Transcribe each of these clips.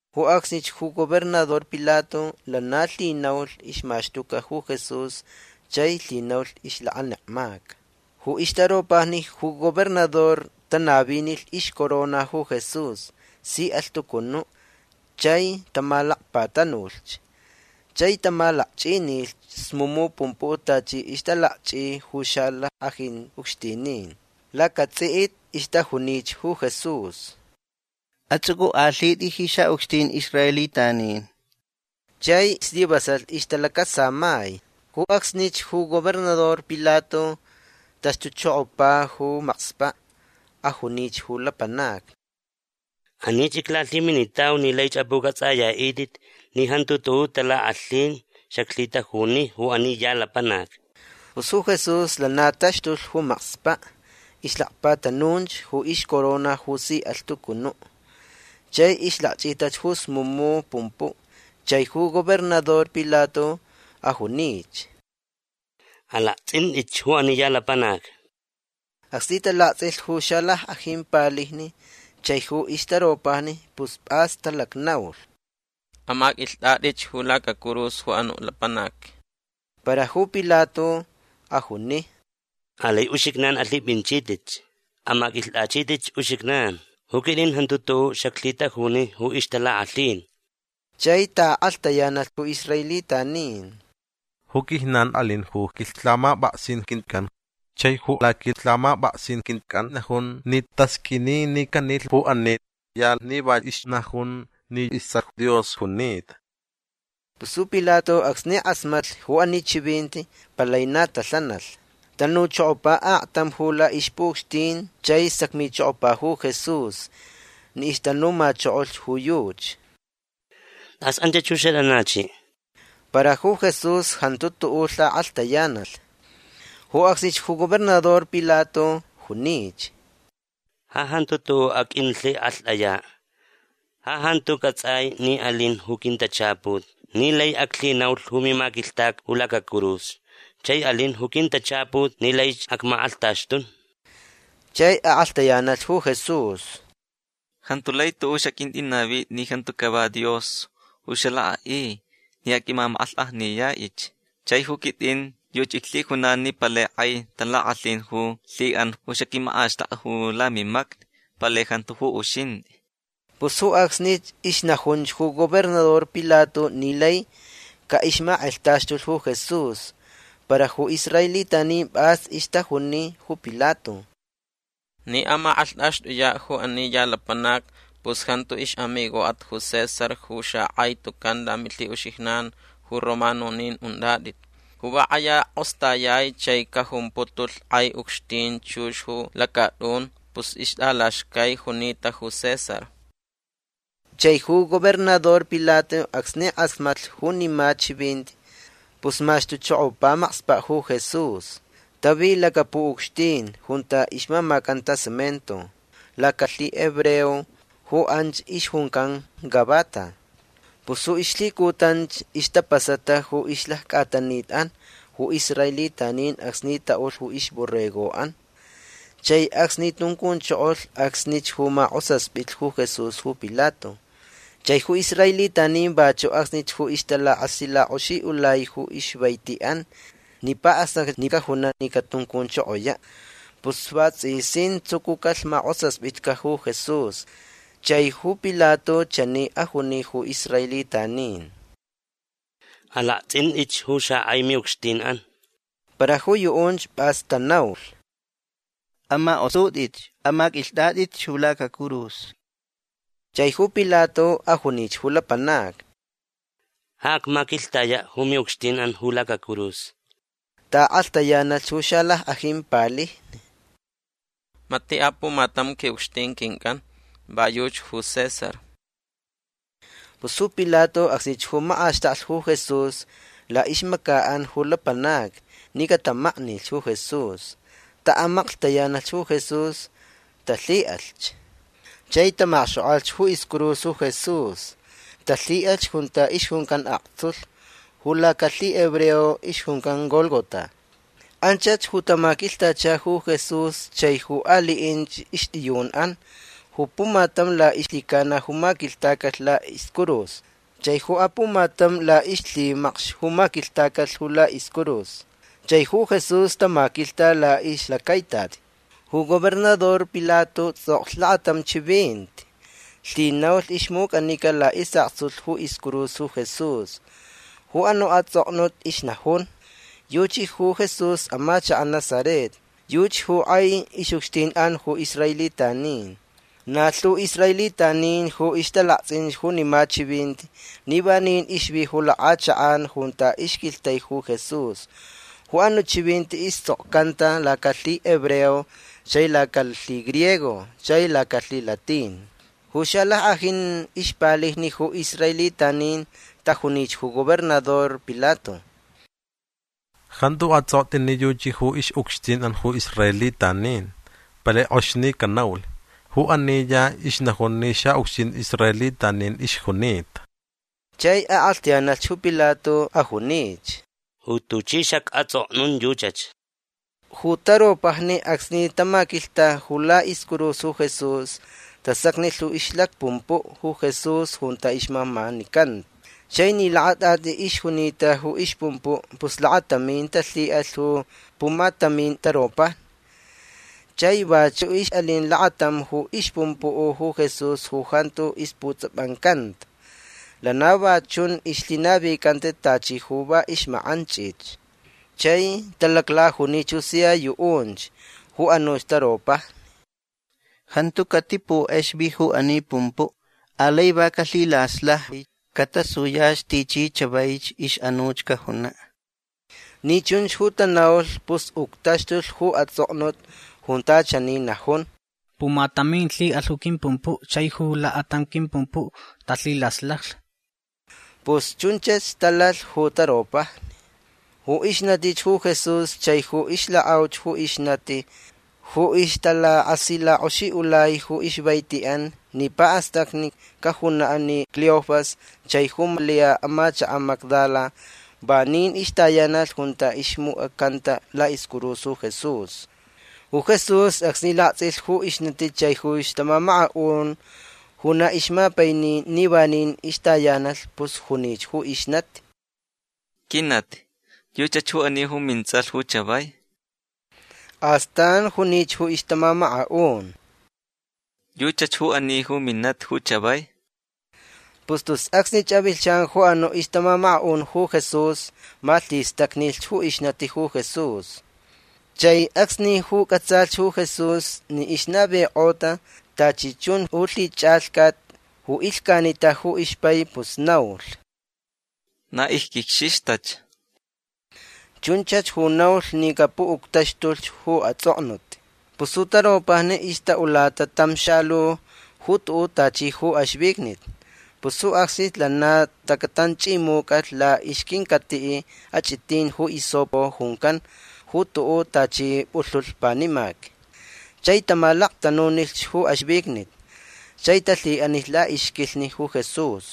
Ju acsnich ju gobernador Pilato lana lhinaulh ixmaxtuca ju Jesús chai lhinaulh ixlakanekmaca. Ju ixtaropajni ju gobernador tanavinilh ixcorona ju Jesús si alhtucunuʼ. Chai tamalacpatanulhch. Chai tamalakchʼinilhch smumu pumpuʼ tachi ixtalakchʼi ju xalackʼajin ucxtinin. Lacatsʼiʼit ixtajunich ju Jesús: ―Atsʼucʼukʼalhitʼi ji xaʼucxtin israelitanin. Chai slivasalh ixtalacasamai. Ju acsnich ju gobernador Pilato taxtuchokopa ju makspaʼ. Ajunich ju lapanacni: ―Anich iclalhiminitau ni laich apʼucʼatsʼayaʼitʼit ni jantu tuʼuʼ talakʼalhin xaclhitajuni ju ani ya lapanac. Pus ju Jesús lana taxtulh ju makspaʼ. Ixlacpatanunch ju ixcorona ju si alhtucunuʼ. Chai ixlakchʼitach ju smumu pumpuʼ. Chai ju gobernador Pilato ajunich: ―Alaktsʼintʼitch ju ani ya lapanac. Acsni talaktsʼilh ju xalackʼajin palijni chai ju ixtaropajni pus pʼas talacnaulh: ―Amaqʼuilhtʼatʼich ju lacacurus ju anuʼ lapanac. Para ju Pilato ajuni: ―Alai uxijnan alhipʼinchitʼitch. Amaqʼuilhtʼachitʼitch uxijnan. Ju quitʼin jantu tuʼuʼ xaclhitajuni ju ixtalakʼalhin. Chai taʼakʼalhtayanalh ju israelitanin: ―Ju quijnan alin ju quilhamapʼaksin quincʼan. Chai ju laquilhamapʼaksin quincʼan najun ni tasqʼuini ni canilh ju ani ya ni va ixnajun ni istsʼalh Dios junita. Pus ju Pilato acsni kʼasmatlh ju ani chivinti palai na talhanalh. Tanuchokopa aktam ju laʼixpuʼucxtin chai sacmichokopa ju Jesús ni ixtanumachokolhch ju yuchi: ―Tʼas anchach ju xatʼanachiʼ. Para ju Jesús jantu tuʼuʼ lhakʼalhtayanalh. Ju acsnich ju gobernador Pilato junich: ―Ja jantu tuʼuʼ aqʼuinlhikʼalhtʼayaʼ. Ja jantu cʼatsʼai ni alin ju quintachaput ni lai aclhinaulh ju mimaquilhtaca ju lacacurus. Chai alin ju quintachaput ni laich acmakʼalhtaxtun. Chai akʼalhtayanalh ju Jesús: ―Jantu lai tuʼuʼ xaqʼuintʼinavitʼi ni jantu cava Dios ju xalakʼaʼi ni aqʼuimamakʼalhkʼajniyaʼich. Chai ju quitʼin yuchi iclhijunan ni palai kʼai talakʼalhin ju lhiʼan ju xaquimakʼaxtʼakʼa ju lamimacni. Palai jantu ju uxintʼi. Pus ju acsnich ixnajunch ju gobernador Pilato ni lai caʼixmakʼalhtaxtulh ju Jesús. Para ju israelitanin pʼas ixtajuni ju Pilato: ―Ni amakʼalhtʼaxtʼuyaʼ ju ani ya lapanac pus jantu ixʼamigoʼat ju César ju xakʼai tucan lamilhiʼuxijnan ju romanonin untʼatʼit. Ju va kʼaya kʼostayai chai cajumputulh kʼai ucxtin chux ju lacatʼun pus ixtʼalaxcaich junita ju César. Chai ju gobernador Pilato acsni kʼasmatlh junima chivinti pus maxtuchokopa makspaʼ ju Jesús. Tavi lacapuʼucxtin junta ixmamacanta cemento. Lacalhihebreo ju anch ixjuncan Gabata. Pus ju ixlhicutanch ixtapasata ju ixlaccʼatanitʼan ju israelitanin acsni taʼulh ju ixborregoʼan. Chai acsni tuncunchokolh acsnich ju makʼosaspitlh ju Jesús ju Pilato. Chai ju israelitanin vachuʼ acsnich ju ixtalakasilakʼoxiʼulai ju ixvaitiʼan ni paʼastacni cajunaʼ ni catuncunchokoyaʼ. Pus vatsʼisin tsucucalh makʼosaspitca ju Jesús. Chai ju Pilato chani ajuni ju israelitanin: ―Alaktsʼintʼitch ju xakʼai miʼucxtinʼan. Para ju yuʼunch pʼas tanaulh: ―Amakʼosutʼich. Amaqʼuilhtʼatʼich ju lacacurus. Chai ju Pilato ajunich ju lapanacni: ―Ja acmaquilhtayaʼ ju miʼucxtinʼan ju lacacurus. Taʼakʼalhtayanalh ju xalackʼajin palijni: ―Matiʼ apumatam quiʼucxtin quincʼan. Va yuchi ju César. Pus ju Pilato acsnich ju makʼaxtaklh ju Jesús laʼixmacaʼan ju lapanacni ni catamaknilh ju Jesús. Taʼamaklhtayanalh ju Jesús. Talhiʼalhch. Chai tamakxkʼokʼalh ju iscurus ju Jesús. Talhiʼalhch junta ixjuncan Aktsulh. Ju lacalhihebreo ixjuncan Gólgota. Anchach ju tamaquilhtachalhch ju Jesús chai ju aliʼinch ixtʼiyunʼan. Ju pumatam laʼixlhicana ju maquilhtacalh laʼiscurus chai ju apumatam laʼixlhimacx ju maquilhtacalh ju laʼiscurus. Chai ju Jesús tamaquilhta laʼixlacaitati. Ju gobernador Pilato tsʼoklh lakatam chivinti. Lhinaulh ixmucʼanica laʼisʼaktsulh ju iscurus ju Jesús. Ju anuʼ atsʼoknut ixnajun: “Yuchi ju Jesús amachakaʼ Nazaret. Yuchi ju kʼai ixʼucxtinʼan ju israelitanin”. Na lhu israelitanin ju ixtalaktsʼin junima chivinti ni vanin ixvi ju lakʼachakʼan junta ixquilhtai ju Jesús. Ju anuʼ chivinti istsʼokcanta lacalhihebreo chai lacalhigriego chai lacalhilatin. Ju xalackʼajin ixpalijni ju israelitanin tajunich ju gobernador Pilato: ―Jantu atsʼoktʼi ni yuchi ju ixʼucxtinʼan ju israelitanin. Palai kʼox ni canaulh: “Ju ani ya ixnajun ni xaʼucxtin israelitanin ixjunita”. Chai akʼalhtayanalh ju Pilato. Ajunich: ―Ju tuchi xacʼatsʼoknun yuchach. Ju taropajni acsni tamaquilhta ju laʼiscurus ju Jesús tasacnilh ju ixlacpumpuʼ ju Jesús junta ixmamanicanta. Chai ni lakatʼatʼi ixjunita ju ixpumpuʼ pus lakatamin talhiʼalh ju pumatamin taropajni. Chai vachuʼ ixʼalin lakatam ju ixpumpuʼ ju Jesús ju jantu isputsʼapancanta. Lana va chunch ixlhinavicanta. Tachi ju va ixmakʼanchʼich. Chai talaclajunich ju sia yuʼunch ju anuch taropajni: ―Jantu catipukʼexvi ju ani pumpuʼ. Alai va calhilaslajvi. Catasuyach tichi chavaich ixʼanuch cajunaʼ. Ni chunch ju tanaulh pus uctaxtulh ju atsʼoknut junta chani najun: “Pumatamin lhiʼalh ju quimpumpuʼ. Chai ju lakatam quimpumpuʼ talhilaslajlh”. Pus chunchach talalh ju taropajni. Ju ixnatich ju Jesús chai ju ixlakʼauch ju ixnati ju ixtalakasilakʼoxiʼulai ju ixvaitiʼan ni paʼastacni cajunaʼ ni Cleofas chai ju Malia amachakaʼ Magdala vanin ixtayanalh junta ixmucʼacanta laʼiscurus ju Jesús. Ju Jesús acsni laktsʼilh ju ixnati chai ju ixtamamakaʼun ju na ixmapaini ni vanin ixtayanalh pus junich ju ixnati: ―Quinati yuchach ju ani ju mintsʼalh ju chavai. Astan junich ju ixtamamakaʼun: ―Yuchach ju ani ju minati ju chavai. Pus tus acsni avilhchan ju anuʼ ixtamamakaʼun ju Jesús malhistacnilh ju ixnati ju Jesús. Chai acsnich ju cʼatsalhch ju Jesús ni ixnavikʼota tachi chun ju lhichʼalhcat ju ilhcanita ju ixpai pus naulh: ―Na icquicxixtach. Chunchach ju naulh ni capuʼuctaxtulhch ju atsʼoknut. Pus ju taropajni ixtaʼulata tam xalu ju tuʼuʼ tachi ju axvicnit. Pus ju acsnich lana tacatanchʼimucalh laʼixquincatiʼ achʼitin ju hisopo juncan ju tuʼuʼ tachi pʼulhulh panimac. Chai tamalaktanunilh ju axvicnit. Chai talhiʼanilh laʼixquilhni ju Jesús.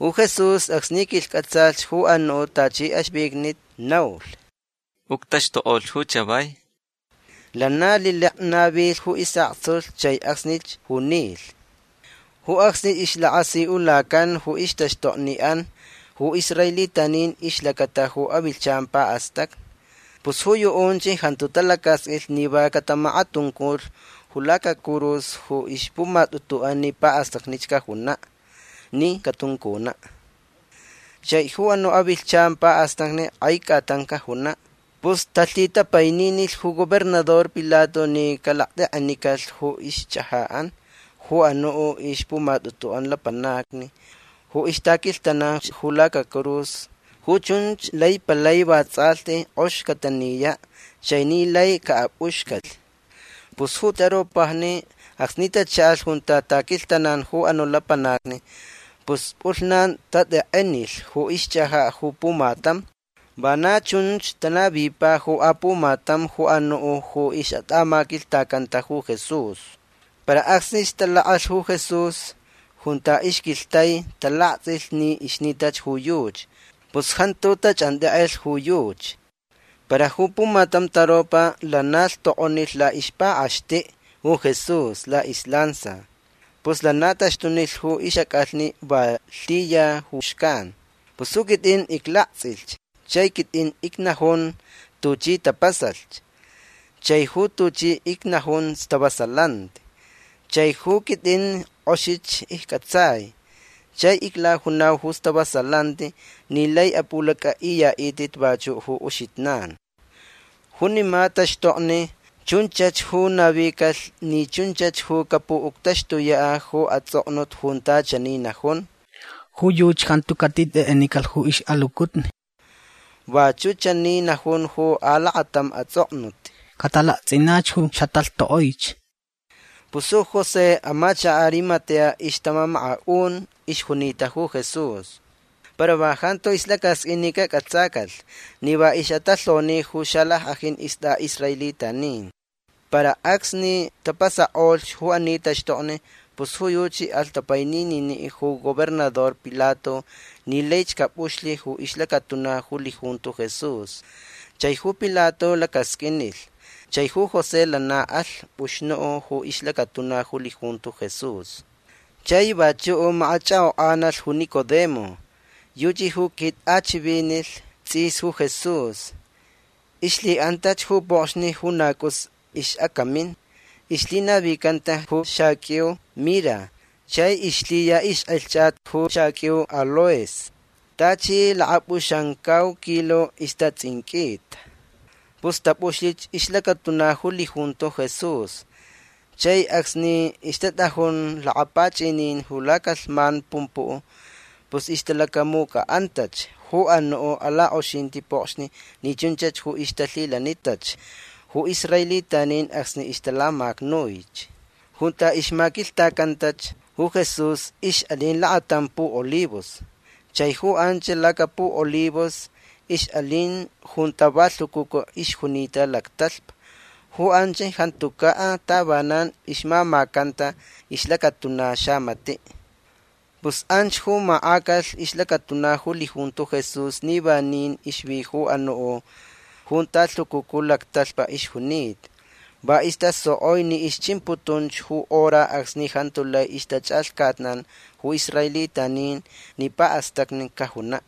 Ju Jesús acsni quilhcʼatsalhch ju anuʼ tachi axvicnit naulh: ―Uctaxtukʼolh ju chavai. Lana lilek navilh ju isʼaktsulh chai acsnich ju nilh. Ju acsnich ixlakasiʼulacan ju ixtaxtokniʼan ju israelitanin ixlacata ju avilhchan paʼastacni. Pus ju yuʼunch jantu talacasqʼuilh ni va catamakatunculh ju lacacurus ju ixpumatʼutuʼan ni paʼastacni cajunaʼ ni catuncunaʼ. Chai ju anuʼ avilhchan paʼastacni kʼai cʼatan cajunaʼ. Pus talhitapaininilh ju gobernador Pilato ni calaktekʼenicalh ju ixchʼajaʼan ju anuʼ ixpumatʼutuʼan lapanacni ju ixtaquilhtananch ju lacacurus. Ju chunch lai palai vatsʼalhti kʼox cataniyaʼ chai ni lai caʼapʼuxcalh. Pus ju taropajni acsni tachaʼalh junta taquilhtananch ju anuʼ lapanacni pus pʼulhnan tatekʼenilh ju ixchʼajaʼ ju pumatam. Vana chunch tanavipa ju apumatam ju anuʼ ju ixʼatʼamaquilhtacanta ju Jesús. Para acsni talakʼalh ju Jesús junta ixquilhtai talaktsʼilh ni ixnitach ju yuchi. Pus jantu tachʼantekʼelh ju yuchi. Para ju pumatam taropa lana lhtokʼonilh laʼixpakʼaxtiʼ ju Jesús laʼislansa. Pus lana taxtunilh ju ixʼacʼalhni. Va lhiya ju xcan. Pus ju quitʼin iclaktsʼilhch chai quitʼin icnajun tuchi tapasalhch. Chai ju tuchi icnajun stavasalanti. Chai ju quitʼin kʼoxich iccʼatsai. Chai iclajunau ju stavasalanti ni lai apʼulacʼaʼiyaʼitʼit vachuʼ ju uxijnan. Junima taxtokni chunchach ju navicalh ni chunchach ju capuʼuctaxtuyaʼ ju atsʼoknut junta chani najun: “Ju yuchi jantu catitekʼenicalh ju ixʼalucutni”. Vachuʼ chani najun ju alakatam atsʼoknut: “Catalaktsʼinach ju xatalhtokʼoich”. Pus ju José amachakaʼ Arimatea ixtamamakaʼun ixjunita ju Jesús. Para va jantu ixlacasqʼuin ni cacʼatsacalh ni va ixʼatalhoni ju xalackʼajin istʼaʼisraelitanin. Para acsni tapasakʼolhch ju ani taxtokni pus ju yuchi alh tapainininiʼ ju gobernador Pilato ni laich capʼuxlh ju ixlacatuna ju lijunto Jesús. Chai ju Pilato lacasqʼuinilh. Chai ju José lana alh pʼuxnuʼ ju ixlacatuna ju lijunto Jesús. Chai vachuʼ makachʼakʼokʼanalh ju Nicodemo. Yuchi ju quitʼachivinilh tsʼis ju Jesús. Ixlhiʼantach ju pokxni ju na cʼus ixʼacamin. Ixlhinavicanta ju xaqʼuiu mira chai ixlhiya ixkʼalhchat ju xaqʼuiu aloes. Tachi lakapʼuxamcau kilo istatsʼinqʼuita. Pus tapʼuxlich ixlacatuna ju lijunto Jesús. Chai acsni ixtatʼajun lakapachʼinin ju lacalhman pumpuʼ pus ixtalacamucʼaʼantach ju anuʼ alakʼoxinti pokxni ni chunchach ju ixtalhilanitach ju israelitanin acsni ixtalamacnuich. Junta ixmaquilhtacantach ju Jesús ixʼalin lakatam puʼolivos. Chai ju anch lacapuʼolivos ixʼalin junta va lhucucu ixjunita lactalhpa. Ju anch jantucaʼ tavanan ixmamacanta ixlacatuna xamatiʼ. Pus anch ju makʼacalh ixlacatuna ju lijunto Jesús ni vanin ixvi ju anuʼ junta lhucucu lactalhpa ixjunita. Va istasokʼoi ni ixchimputun ju hora acsni jantu lai ixtachʼalhcatnan ju israelitanin ni paʼastacni cajunaʼ.